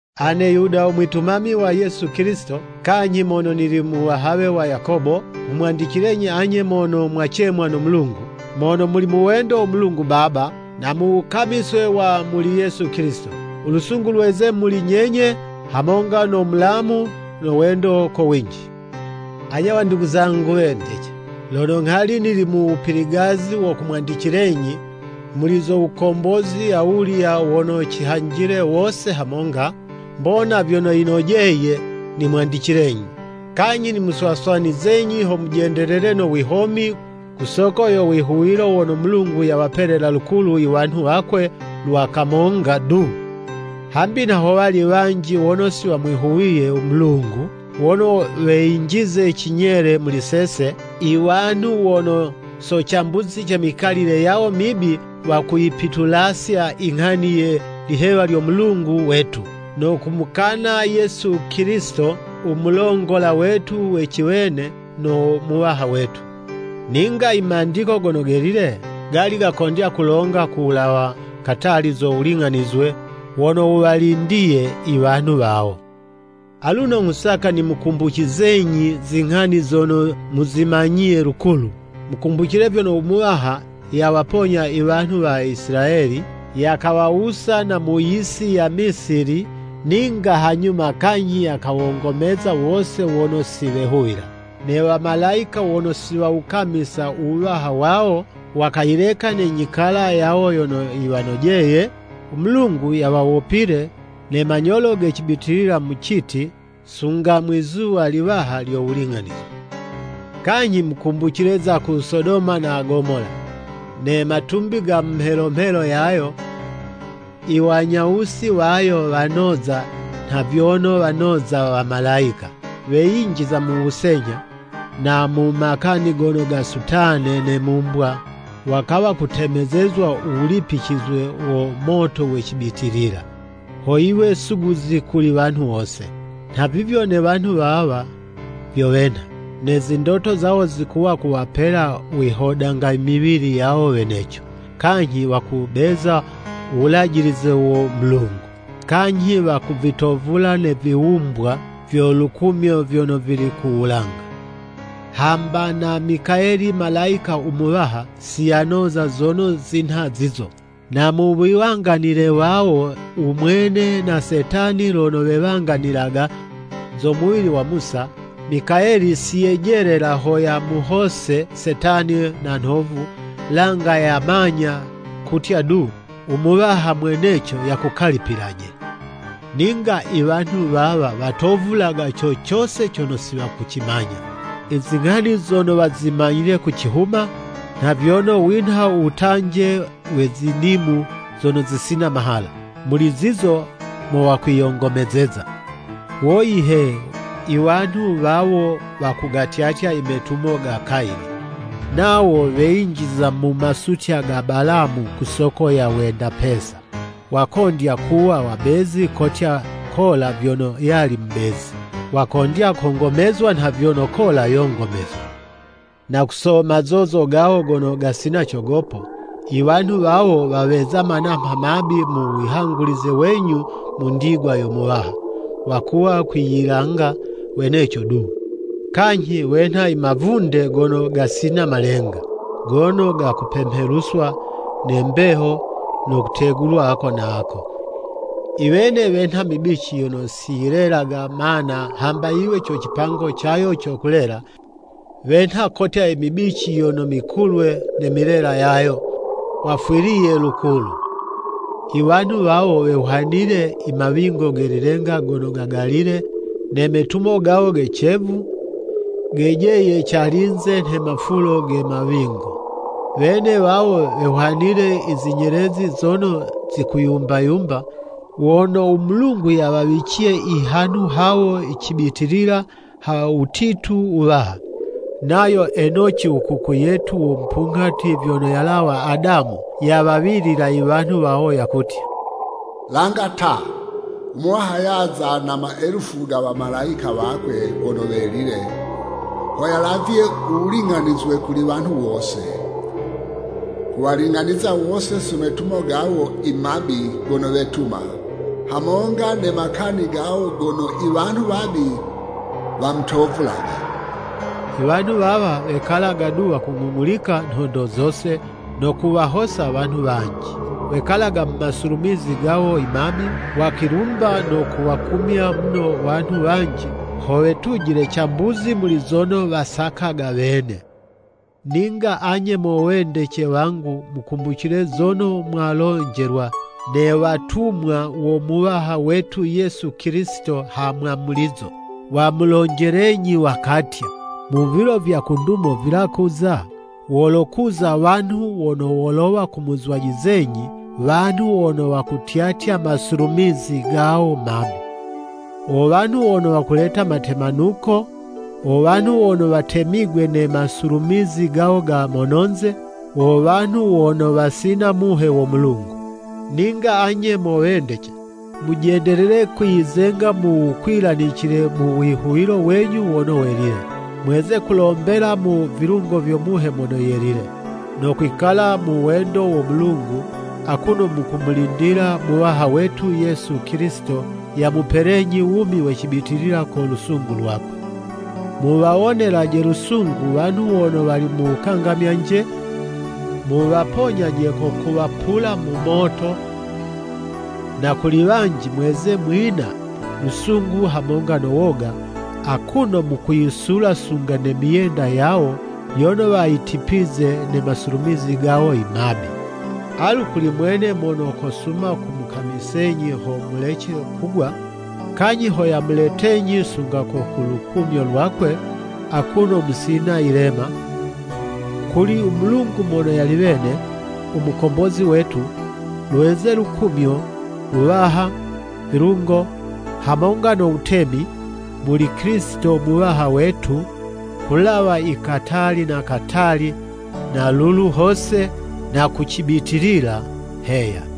Ane Yuda u mwitumami wa Yesu Kilisito, kanyhi mono nili muwahawe wa Yakobo, nghumwandicilenyi anye mono mwacemwa no Mulungu, mono muli mu wendo wo Mulungu Baba, na mu wukamiswe wa muli Yesu Kilisito. U lusungu luweze muli nyenye, hamonga no mulamu no wendo ko winji. Anye wandugu zangu wendece, lono nghali nili mu wupiligazi wo kumwandicilenyi muli zo wukombozi awulya wono cihanjile wose hamonga, mbona vyono yinojeye nimwandicilenyi, kanyhi nimuswaswanizenyi ho mujendelele no wihomi ku soko yo wihuwilo wono Mulungu yawapelela lukulu i wanhu wakwe lwa kamonga du. Hambi nha howali wanji wono siwamwihuwiye u Mulungu, wono weyinjize cinyele muli sese, i wanhu wono so cambuzi ce mikalile yawo mibi, wakuyipitulasya inghani ye lihewa lyo Mulungu wetu, no kumukana Yesu Kilisito u mulongola wetu we ciwene no Muwaha wetu. Ninga i Mandiko Gono Gelile, gali gakondya kulonga ku wulawa katali zo wuling'anizwe wono wuwalindiye i wanhu wawo. Aluno nghusaka nimukumbucizenyi zinghani zono muzimanyiye lukulu, mukumbucile vyono u Muwaha yawaponya i wanhu wa Isilayeli, yakawawusa na mu yisi ya Misili, ninga hanyuma kanyhi yakawongomeza wose wono si wehuwila. Ne wamalayika wono si wawukamisa u wuwaha wawo, wakayileka ne nyikala yawo yono yiwanojeye, u Mulungu yawawopile ne manyolo ge cibitilila mu citi, sunga mwizuwa Liwaha lyo wuling'anizwe. Kanyhi mukumbucile za ku Sodoma na Gomola, ne matumbi ga mu mhelo mhelo yayo, i wanyawusi wayo wanoza nha vyono wanoza wamalayika, weyinjiza mu wusenyha, na mu makani gono gasutane ne mumbwa, wakawa kutemezezwa u wulipicizwe wo moto we cibitilila, ho yiwe suguzi kuli wanhu wose. Nhavivyo ne wanhu wawa vyo wenha. Ne zindoto zawo zikuwa kuwapela wihodanga i miwili yawo weneco, kanyhi wakubeza u wulajilize wo Mulungu, kanyhi wakuvitovula ne viwumbwa vyo lukumyo vyono vili ku wulanga. Hamba na Mikayeli Malayika u muwaha, si yanoza zono zinha zizo. Na muwiwanganile wawo u mwene na Setani lono wewanganilaga zo muwili wa Musa, Mikayeli si yejelela ho yamuhose Setani na nhovu, langa yamanya kutya du, “U Muwaha mweneco yakukalipilaje.” Ninga i wanhu wawa watovulaga co cose cono si wakucimanya. I zinghani zono wazimanyile ku cihuma, nha vyono winha u wutanje we zinimu zono zisina mahala, muli zizo mo wakwiyongomezeza. Woyi he! Iwanhu wawo wakugatyatya i metumo ga Kayini. Nawo weyinjiza mu masutya ga Balamu ku soko ya wenda pesa. Wakondya kuwa wabezi kotya Kola vyono yali mubezi, wakondya kongomezwa nha vyono Kola yongomezwa. Na ku so mazozo gawo gono gasina cogopo, i wanhu wawo waweza manamha mabi mu wihangulize wenyu mu ndigwa yo Muwaha, wakuwa kwiyilanga weneco du, kanyhi wenha i mavunde gono gasina malenga, gono gakupemheluswa ne mbeho no kutegulwa ako na ako. I wene wenha mibici yono si yilelaga mana hamba yiwe co cipango cayo co kulela, wenha kotya i mibici yono mikulwe ne milela yayo, wafwiliye lukulu. I wanhu wawo wehwanile i mawingo ge lilenga gono gagalile, ne metumo gawo ge cevu, gejeye calinze nha mafulo ge mawingo. Wene wawo wehwanile i zinyelezi zono zikuyumba-yumba, wono u Mulungu yawawiciye i hanhu hawo cibitilila ha wutitu wuwaha. Nayo Enoci u kuku yetu wo mupunghati vyono yalawa Adamu, yawawilila i wanhu wawo yakutya, “Langa ta, u Muwaha yaza na maelufu ga wamalayika wakwe wono welile, ho yalavye u wuling'anizwe kuli wanhu wose, kuwaling'aniza wose so metumo gawo i mabi gono wetuma, hamonga ne makani gawo gono i wanhu wabi wamutovulaga.” I wanhu wawa wekalaga du wakung'ung'ulika nhondo zose, no kuwahosa wanhu wanji. Wekalaga mu masulumizi gawo i mabi, wakwilumba no kuwakumya muno wanhu wanji, ho wetujile cambuzi muli zono wasakaga wene. Ninga anye mo wendece wangu, mukumbucile zono mwalonjelwa ne watumwa wo Muwaha wetu Yesu Kilisito ha mwamulizo. Wamulonjelenyi wakatya, “Mu vilo vya ku ndumo vilakuza, wolokuza wanhu wono wolowa kumuzwajizenyi, wanhu wono wakutyatya masulumizi gawo mabi.” Wo wanhu wono wakuleta matemanuko, wo wanhu wono watemigwe ne masulumizi gawo ga mononze, wo wanhu wono wasina Muhe wo Mulungu. Ninga anye mo wendece, mujendelele kwiyizenga mu wukwilanicile mu wihuwilo wenyu wono welile. Mweze kulombela mu vilungo vyo Muhe Mono Yelile. No kwikala mu wendo wo Mulungu, akuno mukumulindila Muwaha wetu Yesu Kilisito yamupelenyi wumi we cibitilila ko lusungu lwakwe. Muwawonelaje lusungu wanhu wono wali mu wukangamyanje, muwaponyaje ko kuwapula mu moto, na kuli wanji mweze mwina lusungu hamonga no woga, akuno mukuyisula sunga ne myenda yawo yono wayitipize ne masulumizi gawo i mabi. Alu kuli mwene mono kosuma kumukamisenyi ho mulece kugwa, kanyhi ho yamuletenyi sunga ko ku lukumyo lwakwe akuno musina yilema, kuli u Mulungu mono yali wene, u Mukombozi wetu, lweze lukumyo, Wuwaha, vilungo, hamonga no wutemi, muli Kilisito Muwaha wetu, kulawa i katali na katali, na lulu hose, na ku cibitilila. Heya.